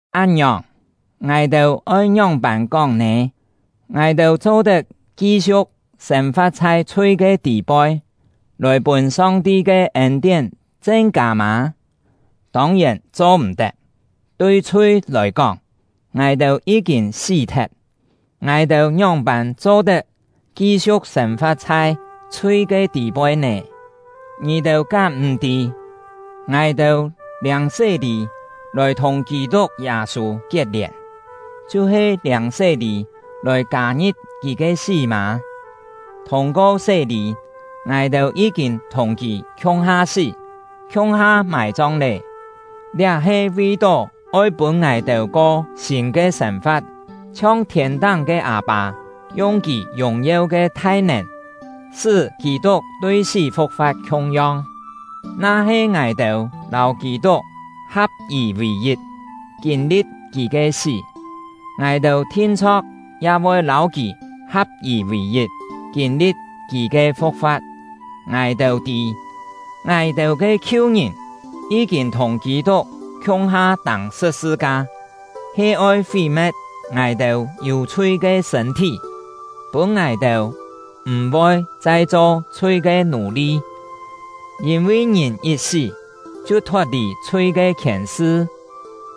Án-ngiòng, ngài-têu oi ngióng-pân kóng nè? Ngài-têu cho-tet ki-siu̍k sên-fa̍t chhai chhui ke tî-poi, lòi pûn Song-ti ke ên-tién chen-kâ mâ? Tông-yèn cho-m̀-tet! Tui chhui lòi kóng, ngài-têu yí-kîn sí-thet. Ngài-têu ngióng-pân cho-tet ki-siu̍k sên-fa̍t chhai chhui ke tî-poi nè? Ngì-têu kám m̀ tî, ngài-têu liâng sé-lî lòi thùng Kî-tuk Yâ-sû kiet-lièn, chhiu-he liâng sé-lî lòi kâ-ngi̍p kì ke sí mâ? Thûng-ko sé-lî, ngài-têu yí-kîn thùng kì khiung-ha sí, khiung-ha mài-chong lé! Liá he vi-tó oi pûn ngài-têu ko sîn ke sên-fa̍t; chhiong thiên-táng ke Â-pâ yung Kì yùng-yeu ke thai-nèn, sṳ́ Kî-tuk tui sí fu̍k-fa̍t khiung-yong. Na-he ngài-têu lâu Kî-tuk ha̍p-yì vì-yit, kîn-li̍t kì ke sí, ngài-têu thin-chho̍k ya voi lâu kì ha̍p-yì vì-yit, kîn-li̍t kì ke fu̍k-fa̍t. Ngài-têu tî, ngài-têu ke khiu-ngìn yí-kîn thùng Kî-tuk khiung-ha tâng sṳ̍p-sṳ-ka, he oi fí-me̍t ngài-têu yû chhui ke sṳ̂n-thí, pûn ngài-têu m̀-voi chai cho chhui ke nù-li; yîn-vi ngìn yit sí, chhiu thot-lì chhui ke khièn-sṳ.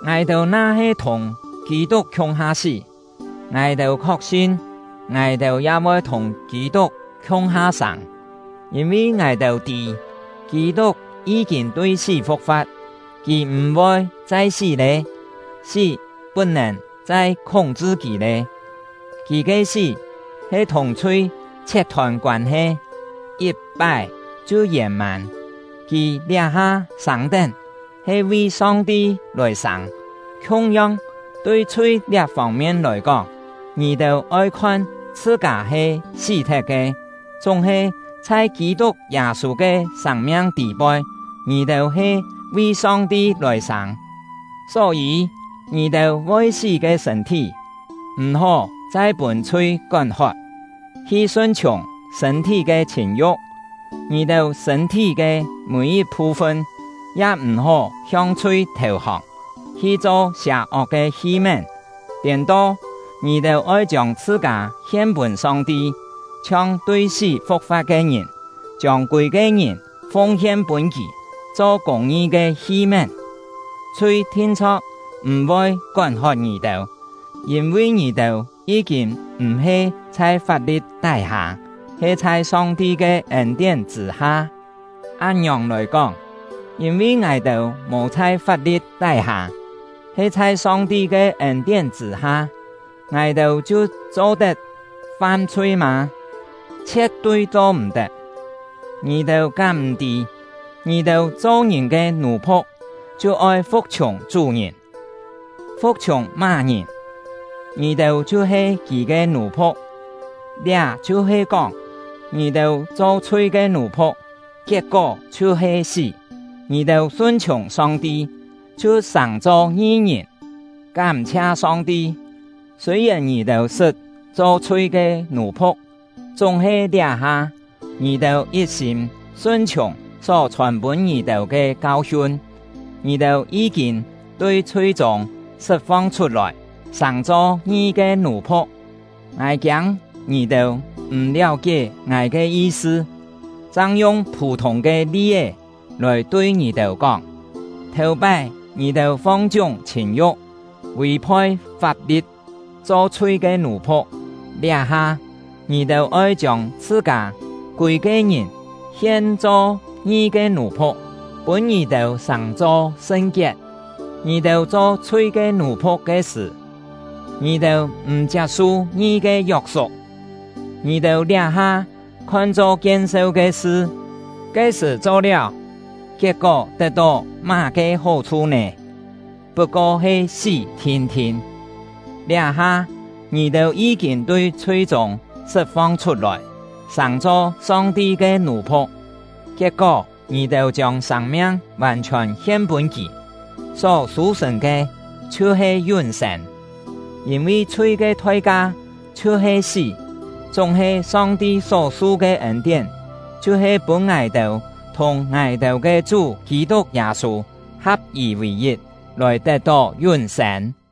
Ngài-têu na-he thùng Kî-tuk khiung-ha sí, ngài-têu khok-sin, ngài-têu ya voi thùng Kî-tuk khiung-ha sâng. Yîn-vi ngài-têu tî, Kî-tuk yí-kîn tui sí fu̍k-fa̍t, kì m̀-voi chai sí lé; sí put-nèn chai khúng-chṳ kì lé. Kì ke sí, he thùng chhui chhiet-thôn koân-he, yit-pái chhiu yèn-mân; kì liá-ha sâng-tén, he vi Song-ti lòi sâng. Khiung-yong, tui chhui liá fông-mien lòi kóng, ngì-têu oi khon chhṳ-kâ he sí-thet ke, chúng-he chhai Kî-tuk Yâ-sû ke sâng-miang tî-poi, ngì-têu he vi Song-ti lòi sâng. Só-yî, ngì-têu voi sí ke sṳ̂n-thí m̀-hó chai pûn chhui kón-hot, hi sun-chhiùng sṳ̂n-thí ke chhìn-yu̍k. Ngì-têu sṳ̂n-thí ke mî-yit phu-fun ya m̀-hó hiong chhui thèu-hòng, hi cho sià-ok ke hi-mén. Tiên-to, ngì-têu oi chiông chhṳ-kâ hien-pûn Song-ti, chhiong tui sí fu̍k-fa̍t ke ngìn, chiông kûi-ke ngìn fung-hien pûn Kì, cho kûng-ngi ke hi-mén. Chhui thin-chho̍k m̀-voi kón-hot ngì-têu; yîn-vi ngì-têu yí-kîn m̀-he chhai fap-li̍t tái-hâ, he chhai Song-ti ke ên-tién chṳ̂-ha. Án-ngiòng lòi kóng, yîn-vi ngài-têu mò chhai fap-li̍t tái-hâ, he chhai Song-ti ke ên-tién chṳ̂-ha, ngài-têu chhiu cho-tet fam-chhui mâ? Chhie̍t-tui cho-m̀-tet! Ngì-têu kám m̀ tî, ngì-têu cho ngìn ke nù-phu̍k chhiu oi fu̍k-chhiùng chú-ngìn; fu̍k-chhiùng má-ngìn, ngì-têu chhiu he kì ke nù-phu̍k. Liá chhiu he kóng, ngì-têu cho chhui ke nù-phu̍k, kiet-kó chhiu he sí; ngì-têu sun-chhiùng Song-ti, chhiu sàng-cho ngi-ngìn. Kám-chhia Song-ti! Sûi-yèn ngì-têu sṳt cho chhui ke nù-phu̍k, chúng-he liá-ha, ngì-têu yit-sîm sun-chhiùng só chhòn pûn ngì-têu ke kau-hiun. Ngì-têu yí-kîn tui chhui-chûng sṳt-fong chhut-lòi, sàng-cho ngi ke nù-phu̍k. Ngài kiâng ngì-têu m̀ liáu-kié ngài ke yi-sṳ, chang yung phû-thûng ke li-é lòi tui ngì-têu kóng. Thèu-pái ngì-têu fong-chiúng chhìn-yu̍k, vì-phoi fap-li̍t, cho chhui ke nù-phu̍k; liá-ha, ngì-têu oi chiông chhṳ-kâ kûi-ke ngìn hien-cho ngi ke nù-phu̍k, pûn ngì-têu sàng-cho sṳn-kiet. Ngì-têu cho chhui ke nù-phu̍k ke sṳ̀, ngì-têu m̀ chiap-su ngi ke yok-suk. Ngì-têu liá-ha khon-cho kien-seu ke sṳ, ke-sṳ̀ cho-liáu, kiet-kó tet-tó má-ke hó-chhu nè? Put-ko he sí thin-thin! Liá-ha, ngì-têu yí-kîn tui chhui-chûng sṳt-fong chhut-lòi, sàng-cho Song-ti ke nù-phu̍k; kiet-kó ngì-têu chiông sâng-miang vàn-chhiòn hien pûn Kì, só sû-sṳ̀n ke chhiu-he yún-sên. Yîn-vi chhui ke thoi-ka chhiu-he sí; chúng-he Song-ti só-su ke ên-tién chhiu-he pûn ngài-têu thùng ngài-têu ke Chú Kî-tuk Yâ-sû ha̍p-yì vì-yit, lòi tet-tó yún-sên.